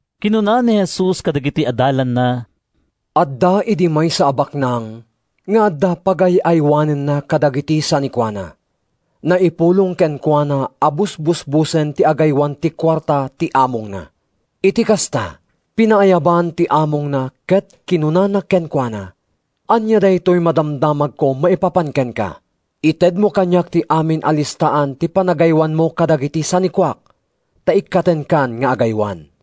Kinuna ni Jesus kadagiti adalanna, “Adda idi maysa a baknang nga adda pagay-aywanenna kadagiti sanikuana. Naipulong kenkuana a busbusbosen ti agaywan ti kuarta ti amongna. “Iti kasta, pinaayaban ti amongna ket kinunana kenkuana, ‘Ania daytoy madamdamagko maipapan kenka? Itedmo kaniak ti amin a listaan ti panagaywanmo kadagiti sanikuak, ta ikkatenkan nga agaywan.’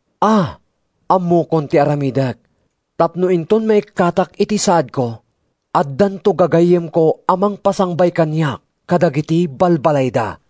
A, ammokon ti aramidek tapno inton maikkatak iti saadko, addanto gagayyemko a mangpasangbay kaniak kadagiti balbalayda.’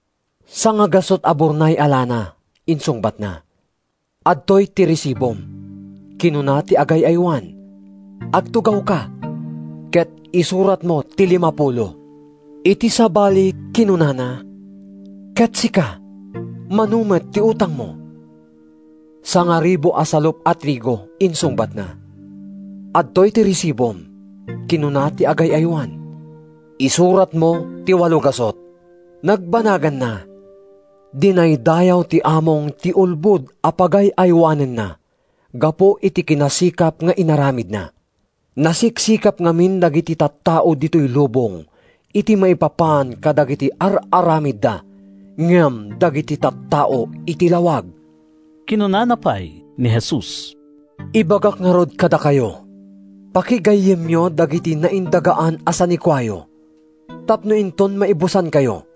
‘Sangagasut a burnay a lana,’ insungbatna. ‘Adtoy ti resibom,’ kinuna ti agay-aywan. ‘Agtugawka ket isuratmo ti limapulo.’ Iti sabali kinunana, ‘Ket sika, mano met ti utangmo?’ ‘Sangaribu a salup a trigo,’ insungbatna. ‘Adtoy ti resibom,’ kinuna ti agay-aywan. ‘Isuratmo ti walogasut.’ “Nagbanaganna, dinaydayaw ti among ti ulbod a pagay-aywanenna gapu iti kinasikap nga inaramidna. Nasiksikap ngamin dagiti tattao ditoy lubong iti maipapan kadagiti ar-aramidda ngem dagiti tattao iti lawag.” Kinuna pay ni Jesus, “Ibagak ngarud kadakayo, pakigayyemyo dagiti naindagaan a sanikuayo tapno inton maibusankayo,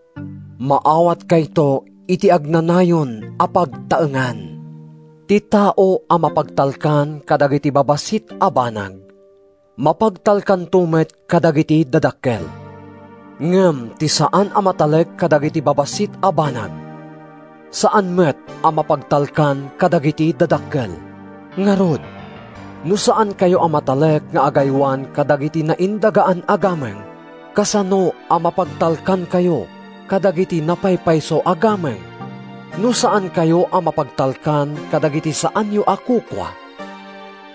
maawatkayto iti agnanayon a pagtaengan. Ti tao a mapagtalkan kadagiti babassit a banag, mapagtalkanto met kadagiti dadakkel. Ngem ti saan a matalek kadagiti babassit a banag, saan met a mapagtalkan kadagiti dadakkel. Ngarud, no saankayo a matalek nga agaywan kadagiti naindagaan a gameng, kasano a mapagtalkankayo kadagiti napaypayso a gameng? No saankayo a mapagtalkan kadagiti saanyo a kukua,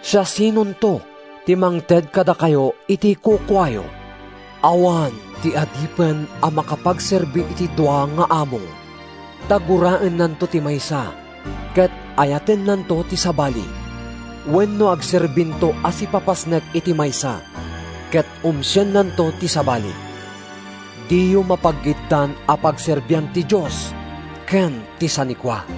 siasinonto ti mangted kadakayo iti kukuayo? “Awan ti adipen a makapagserbi iti dua nga among. Ta guraennanto ti maysa ket ayatennanto ti sabali, wenno agserbinto a sipapasnek iti maysa ket umsiennanto ti sabali. Diyo mapaggiddan a pagserbian ti Dios ken ti sanikua.”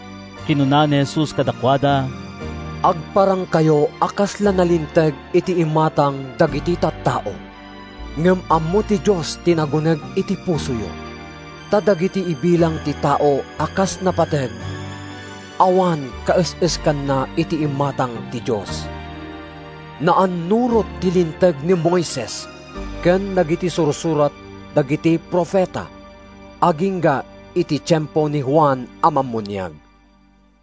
Kinuna ni Jesus kadakuada, “Agparangkayo a kasla nalinteg iti imatang dagiti tattao. Ngem ammo ti Dios ti naguneg iti pusoyo. Ta dagiti ibilang ti tao a kas napateg awan kaes-eskanna iti imatang ti Dios. “Naannurot ti Linteg ni Moises ken dagiti sursurat dagiti profeta agingga iti tiempo ni Juan a Mammuniag.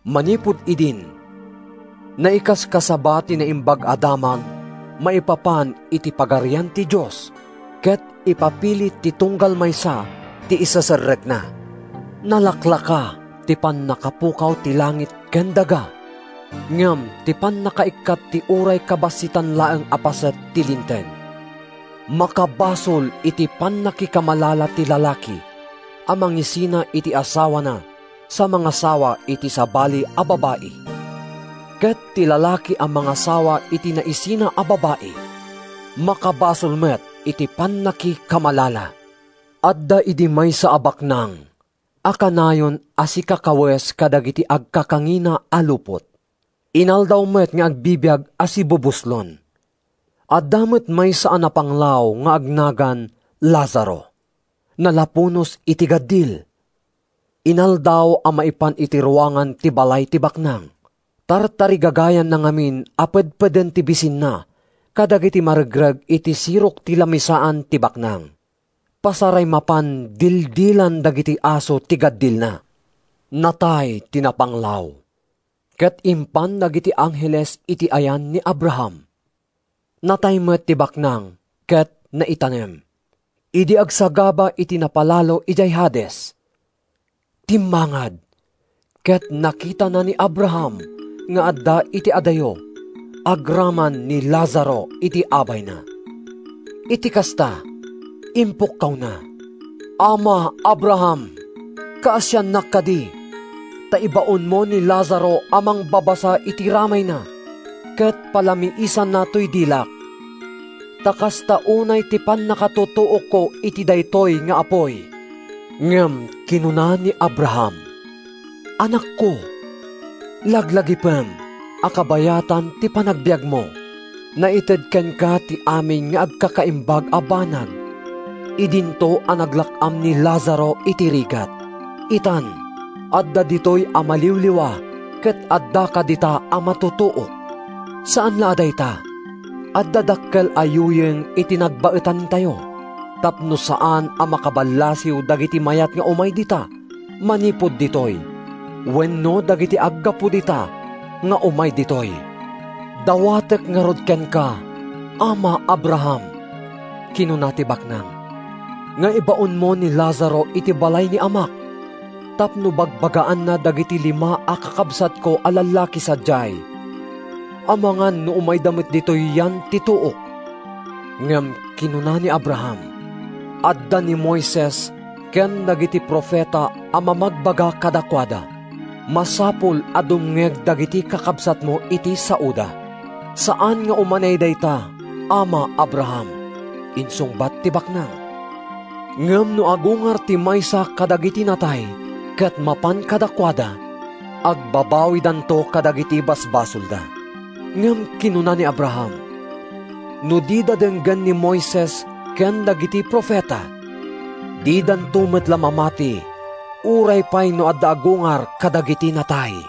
Manipud idin, naikaskasaba ti Naimbag a Damag maipapan iti Pagarian ti Dios, ket ipapilit ti tunggal maysa ti iseserrekna. Nalaklaka ti pannakapukaw ti langit ken daga ngem ti pannakaikkat ti uray kabassitan laeng a paset ti Linteg. “Makabasol iti pannakikamalala ti lalaki a mangisina iti asawana sa mangasawa iti sabali a babai. Ket ti lalaki a mangasawa iti naisina a babai, makabasol met iti pannakikamalala.” “Adda idi maysa a baknang a kanayon a sikakawes kadagiti agkakangina a lupot. Inaldaw met nga agbibiag a sibubuslon. “Adda met maysa a napanglaw nga agnagan Lazaro. Nalapunos iti gaddil. Inaldaw a maipan iti ruangan ti balay ti baknang. Tartarigagayanna ngamin a pedpeden ti bisinna kadagiti maregreg iti sirok ti lamisaan ti baknang. Pasaray mapan dildilan dagiti aso ti gaddilna. “Natay ti napanglaw ket impan dagiti angheles iti ayan ni Abraham. Natay met ti baknang ket naitanem. Idi agsagaba iti napalalo idiay Hades, timmangad ket nakitana ni Abraham nga adda iti adayo agraman ni Lazaro iti abayna. Iti kasta, impukkawna, ‘Ama Abraham! Kaasiannak kadi ta ibaonmo ni Lazaro a mangbabasa iti ramayna ket palamiisanna toy dilak, ta kasta unay ti pannakatutuokko iti daytoy nga apuy!’ “Ngem kinuna ni Abraham, ‘Anakko, laglagipem a kabayatan ti panagbiagmo, naited kenka ti amin nga agkakaimbag a banag idinto a naglak-am ni Lazaro iti rigat. Itan, adda ditoy a maliwliwa ket addaka dita a matutuok. Saan la a dayta! Adda dakkel a yuyeng iti nagbaetantayo tapno saan a makaballasiw dagiti mayat nga umay dita manipud ditoy wenno dagiti aggapu dita nga umay ditoy.’ “‘Dawatek ngarud kenka, ama Abraham,’ kinuna ti baknang, ‘nga ibaonmo ni Lazaro iti balay ni amak tapno bagbagaanna dagiti lima a kakabsatko a lallaki sadiay, amangan no umayda met ditoy yan ti tuok.’ “Ngem kinuna ni Abraham, ‘Adda ni Moises ken dagiti profeta a mamagbaga kadakuada. Masapul a dumngeg dagiti kakabsatmo iti saoda.’ “‘Saan nga umanay dayta, ama Abraham,’ insungbat ti baknang. ‘Ngem no agungar ti maysa kadagiti natay ket mapan kadakuada, agbabawidanto kadagiti basbasolda.’ “Ngem kinuna ni Abraham, ‘No dida denggen ni Moises ken dagiti profeta, didanto met la mamati, uray pay no adda agungar kadagiti natay.’”